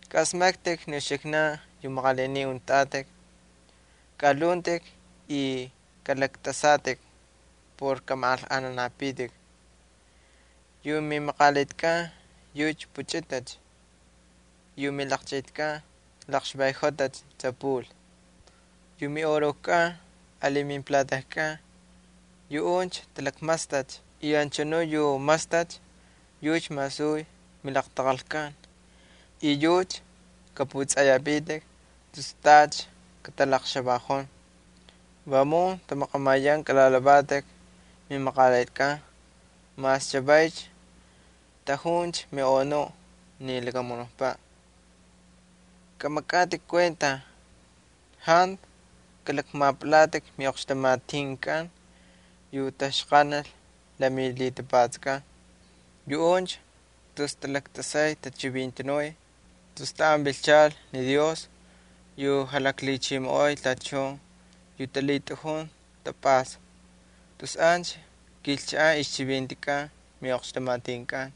Kaꞌasmaktꞌik ni uxiknan yu maqalinin untꞌatꞌik. Kaꞌalhuntꞌik y kꞌalaktꞌasatꞌik por kꞌamaꞌanlꞌajnanapitik. Yu mimaqalitkꞌan yucha puchꞌitacha y yu milaqchꞌitkꞌan laqxvayꞌojotacha tsapul. Yu miꞌorojkꞌan ali mimplatajkꞌan yuꞌuncha talaqmastacha y anchanuꞌ yu mastacha yucha masuy milaqtaqalkꞌan y yucha kꞌapꞌutsꞌanꞌayapitik tus tacha katalaqxavaꞌon. Vamun tamaqamayan kꞌalalhavatꞌik mimaqalitkꞌan mas chavaycha tꞌajuncha miꞌonuꞌ ni lakamunukpaꞌ. Kꞌamakꞌatꞌik kuenta. Jantu kꞌalakmapꞌalatꞌik miꞌoqxtamatinkꞌan yu taxqanal la milhitapatskꞌan. Yuꞌuncha tus talaktꞌasay tachivintanuy. Tus taꞌan vilchal ni Dios yu jalaklhichimoꞌoy tachun yu talhitꞌajun tapꞌasta, tus ancha kilchaꞌan ixchivintikꞌan miꞌoqxtamatinkꞌan.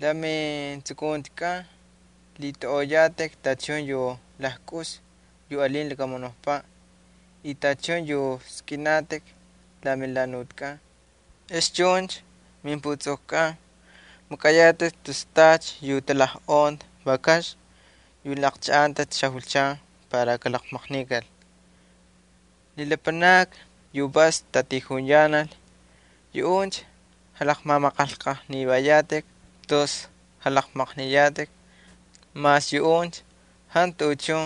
La metsukuntikꞌan lhitꞌaunꞌoyatꞌik tachun yu lajkꞌus yu alin lakamunukpaꞌ y tachun yu skꞌinatꞌik la melhanutkꞌan. Ex chuncha mimputsukukꞌan makꞌayatꞌik tus tacha yu talajꞌonta vakaxna yu laqchaꞌantacha xajulchan para kalaqmaqnikal. Ni lapanakni yu vas tatijuyanal, yuꞌuncha jalaqmamaꞌanlꞌajnivayatꞌik tus jalaqmaqniyatꞌik, mas yuꞌuncha jantu tuꞌuchun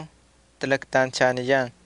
talaktanchaniyan.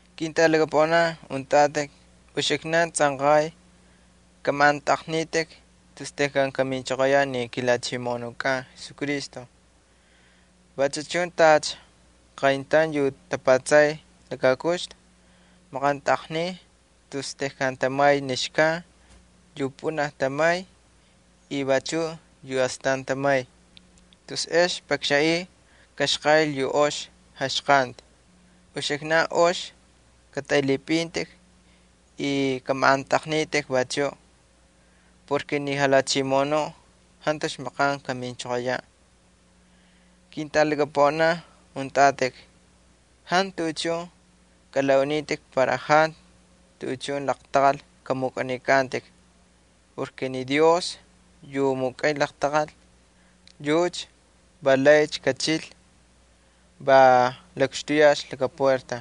Ketꞌalaqaunin, uxiknan tsꞌanqay kꞌamaꞌantꞌaqnitꞌik tus tejkan kaminchoqoyaꞌ ni kiJalhachimoꞌonukꞌan Jesucristo. Vachu chun tacha qayntaun yu tapatsay laka kuxtu maqantꞌaqniy tus tejkan tamay ni xkan yu pꞌunaj tamay y vachuꞌ yu astan tamay, tus ex pakxanꞌiy kaxqaꞌil yu ox jaxqanti. Uxiknan ox katꞌaylhipꞌintꞌik y kꞌamaꞌantꞌaqnitꞌik vachuꞌ, porke ni Jalhachimoꞌonuꞌ jantucha maqan kaminchoqoyaꞌ. Ketꞌalaqaunin, jantu tuꞌuchun kꞌalaꞌunitꞌik para jantu tuꞌuchun laqtaqal kꞌamukꞌanikꞌantꞌik. Ni Dios yu mukꞌay laqtaqal, yucha va laycha kachil, va lakxtuyalcha laka puerta.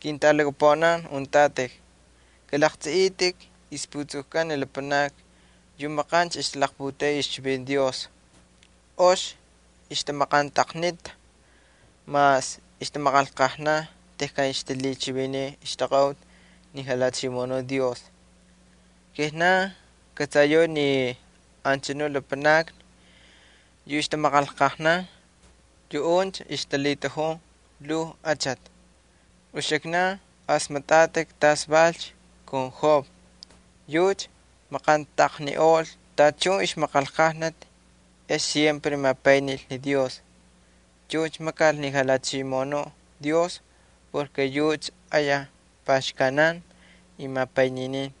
Ketꞌalaqaunin, kalaqtsꞌiꞌitꞌik ixputsukukꞌan ni lapanakni yu maqancha ixtalaqputeꞌey ixchivinti Dios. Ox ixtamaqantꞌaqnita mas ixtamaqanlqajnan tejkan ixtalhichiviniy ixtaqaꞌuti ni Jalhachimoꞌonu Dios. Kijnan kꞌatsayau ni anchanu lapanakni yu ixtamaqanlqajnan, yuꞌuncha ixtalhitꞌajun lhuu achati. Uxiknan asmaktꞌatꞌik tas valcha kun Job. Yucha maqantꞌaqniꞌol tachun ixmaqanlqajnati ex mapaynil ni Jalhachimoꞌonu Dios. Yucha ayaj paxkanan y mapayninin.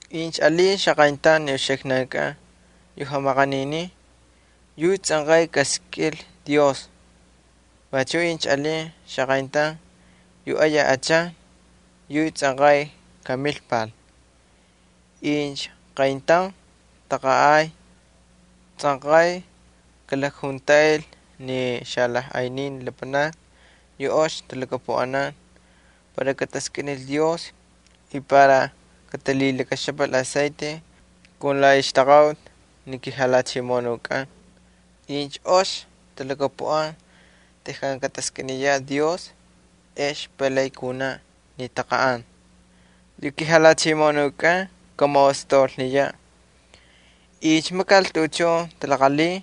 Incha alin qayntaun uxiknan yu jamaqaninin, yucha tsꞌanqay kaskꞌinlhi Dios. Vachu incha alin qayntaun yu ayaj achan, yucha tsꞌanqay kamilpal. Incha qayntaun taqanꞌay, tsꞌanqay kalakjuntaꞌil ni xalajꞌaynin lapanakni yu ox talhakapuꞌanan para kataskꞌinil Dios y para katalhilakaxapal aceite kun la ixtaqaꞌuti ni kiJalhachimoꞌonukꞌan. Incha ox talhakapuꞌan tejkan kataskꞌiniyaꞌ Dios ex palay kunaꞌ ni taqanꞌan. Yu kiJalhachimoꞌonukꞌan kamaꞌostaulniyaꞌ. Incha makal tuꞌuchun talaqalhin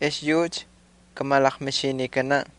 ex yucha kamalaqmixinikanaꞌ.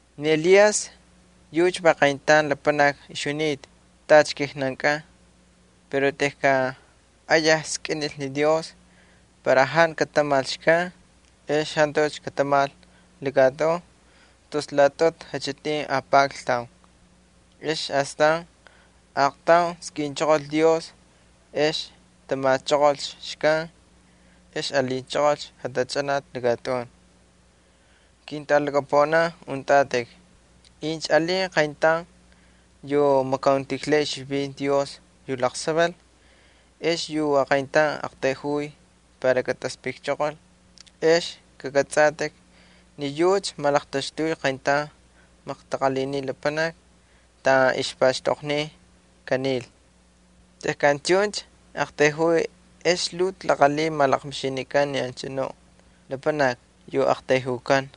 Ni Elías yucha va qayntaun lapanaki ixjunita tacha kijnankꞌan. Pero tejkan ayaj skꞌinlhi ni Dios para jantu katamal xkan, ex jantucha katamal lakatꞌun tus laꞌatꞌutu jachꞌitin apakltaun. Ex astan aaqtaun skꞌinchoqol Dios ex tamachoqolcha xkan, ex alinchoqolcha jatachꞌanati ni lakatꞌun. Ketꞌalaqaunin, incha alin qayntaun yu makauntijlay ixchivinti Dios yu laqsaval ex yu aqayntaun aqtayjuy para kataspꞌikchoqol, ex kakꞌatsꞌatꞌik ni yucha malaqtaxtuycha qayntaun maqtaqalhini lapanaki taꞌan ixpaxtoqniy kanil. Tejkan chuncha aqtayjuy ex lhuu talaqalhin malaqmixinikan ni anchanu lapanaki yu aqtayjukan.